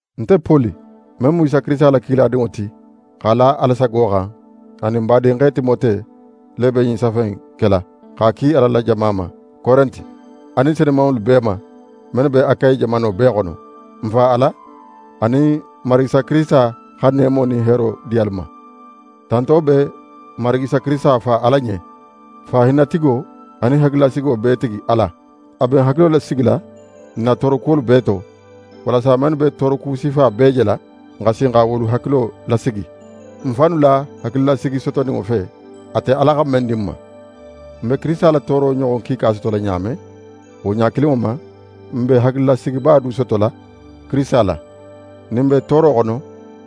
Nte Poli, men mu Isa Kirisita la kiladinŋo ti x'a la Ala sago xan, anin n badinxe Timote le be ɲin safe in kela, x'a ki Ala la jama ma Korente anin senumanŋolu bee ma, mennu be Akayi jamano bee xono. N Fa Ala anin n Marigi Isa Kirisita xa neemo nin heero di alu ma. Tanto be n Marigi Isa Kirisita Fa Ala ɲen, Fa hinnatigo anin hakililasigo bee tigi Ala. A be n hakilo lasigila n na toorokuwolu bee to, walasa mennu be tooroku sifa bee jela, n xa sin xa wolu hakilo lasigi, n fannu la hakililasigi sotoninŋo fe, ate Ala xa men di n ma. N be Kirisita la tooro ɲoxon kiika sotola ɲa men, wo ɲa kilinŋo ma, n be hakililasigiba du sotola Kirisita la. Nin n be tooro xono,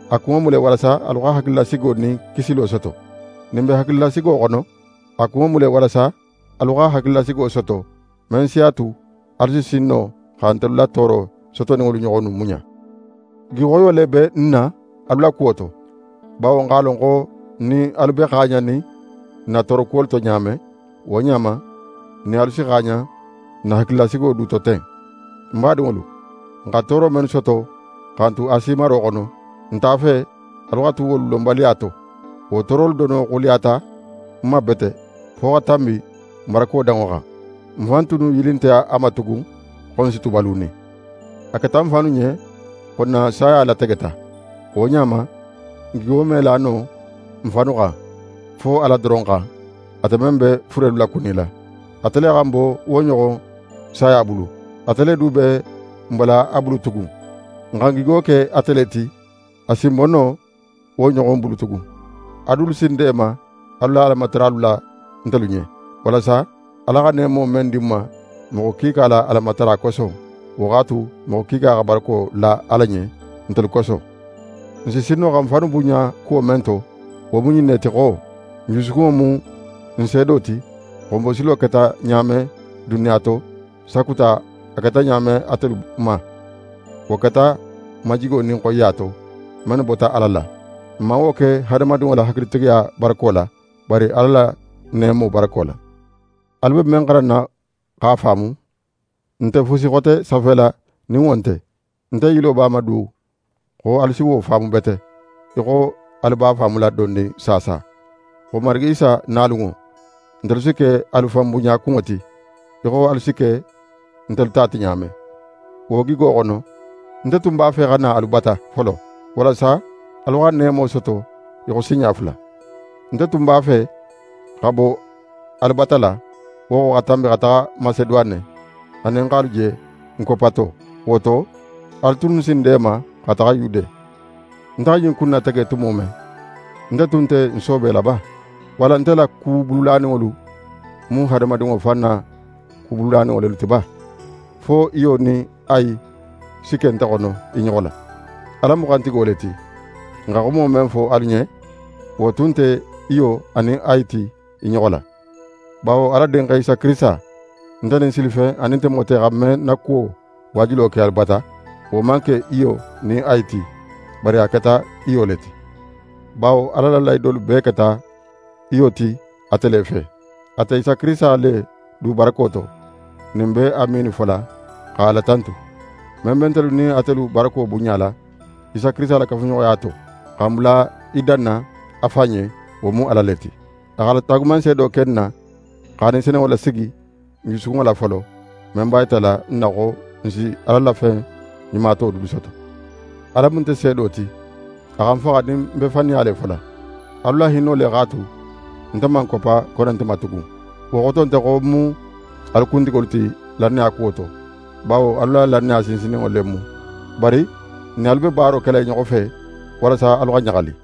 a kunŋo mu le walasa alu xa hakililasigo nin kisilo soto. Nin n be hakililasigo xono, a kunŋo mu le walasa alu xa hakililasigo soto, men si a tu alu si sin no xa ntelu la tooro sotoninŋolu ɲoxonnu muɲa. Gigi xoyo le be n na alu la kuwo to, bawo n x'a lon xo n nin alu be xaaɲannin n na toorokuwolu to ɲa men, wo ɲa ma, n nin alu si xaaɲan n na hakililasigo du to ten. Ń badinŋolu, n xa tooro mennu soto xa n tu Asi maro xono, n nte a fe alu xa tu wolu lonbaliya to: Wo toorolu dono xuliyata n ma bete fo xa tanbi n barako danŋo xan. N fan tunnu yili nte a ma tugun xo n si tu balunin. A keta n fannu ɲen xo ń na saya lategeta. Wo ɲa ma, n gigo me la no n fannu xan, fo Ala doron xan, ate men be furelu lakunila. Ate le xa n bo wo ɲoxon saya bulu. Ate le du be n bola a bulu tugun. N xa n gigo ke ate le ti, a si n bo wo ɲoxon bulu tugun. Alu dulu si n deema alu la Alamataralu la ntelu ɲen, walasa Ala xa neemo men di n ma moxo kiika la Alamatara koso, wo x'a tu moxo kiika xa barako la Ala ɲen ntelu koso. N si sin xa n fannu bunɲa kuwo men to, wo mu ɲin ne ti xo: N jusukunŋo mu n seedo ti xo n bosilo keta ɲa men duniya to, sakuta a keta ɲa men atelu ma, wo keta majigo nin xoyiya to, mennu bota Ala la. N man wo ke hadamadinŋo la hakilitigiya barako la, bari Ala la neemo barako la. Alu be men xaranna x'a faamu, n nte fusi xote safela nin wo nte. Nte yilo b'a ma du xo alu si wo faamu bete, í xo alu b'a faamula dondin saasa, xo Marigi Isa nalunŋo, ntelu si ke alu fanbunɲa kunŋo ti, í xo alu si ke ntelu ta ti ɲa men. Wo gigo xono, nte tun b'a fe xa na alu bata folo, walasa alu xa neemo soto í xo sinɲa fula. Nte tun b'a fe xa bo alu bata la, wo xo xa tanbi xa taxa Maseduwane, anin x'alu je ń koppato. Wo to, alu tunnu si ń deema xa taxa Yude. Nte xa ɲin ku in natege tumo men, nte tun nte ń soobe la ba? Walla nte la ku bululaninŋolu mu hadamadinŋo fan na ku bululaninŋo lelu ti ba, fo «iyo» nin «ayi» si ke nte xono i ɲoxo la? Ala mu xantigo le ti, n xa xumo men fo alu ɲen, wo tun nte «iyo» anin «ayi» ti i ɲoxo la. Bawo Ala Dinxe Isa Kirisita, nte nin Silifen anin Timote xa men na kuwo waajulo ke alu bata, wo man ke «iyo» nin «ayi» ti, bari a keta «iyo» le ti. Bawo Ala la lahidolu bee keta «iyo» ti ate le fe. Ate Isa Kirisita le du barako to, nin n be «amiini» fola xa Ala tantu. Men be ntelu nin atelu barako bunɲala Isa Kirisita la kafuɲoxoya to, xa n bula í dan na a fan ɲen, wo mu Ala le ti. A x'a la taagumanseedo ke n na, xa Ni Senunŋo lasigi n jusukunŋo la folo, men b'a yitala n na xo n si Ala la fen ɲuma to dulu soto. Ala mu nte seedo ti, a xa ń faxa nin ń be faniya le fola: Alu la hinno le x'a tu nte man ń koppa Korente ma tugun. Wo xoto nte xo n mu alu kuntigolu ti lannaya kuwo to, bawo alu la lannaya sinsinninŋo le mu, bari n nin alu be baaro kela i ɲoxo fe, walasa alu xa ɲaxali.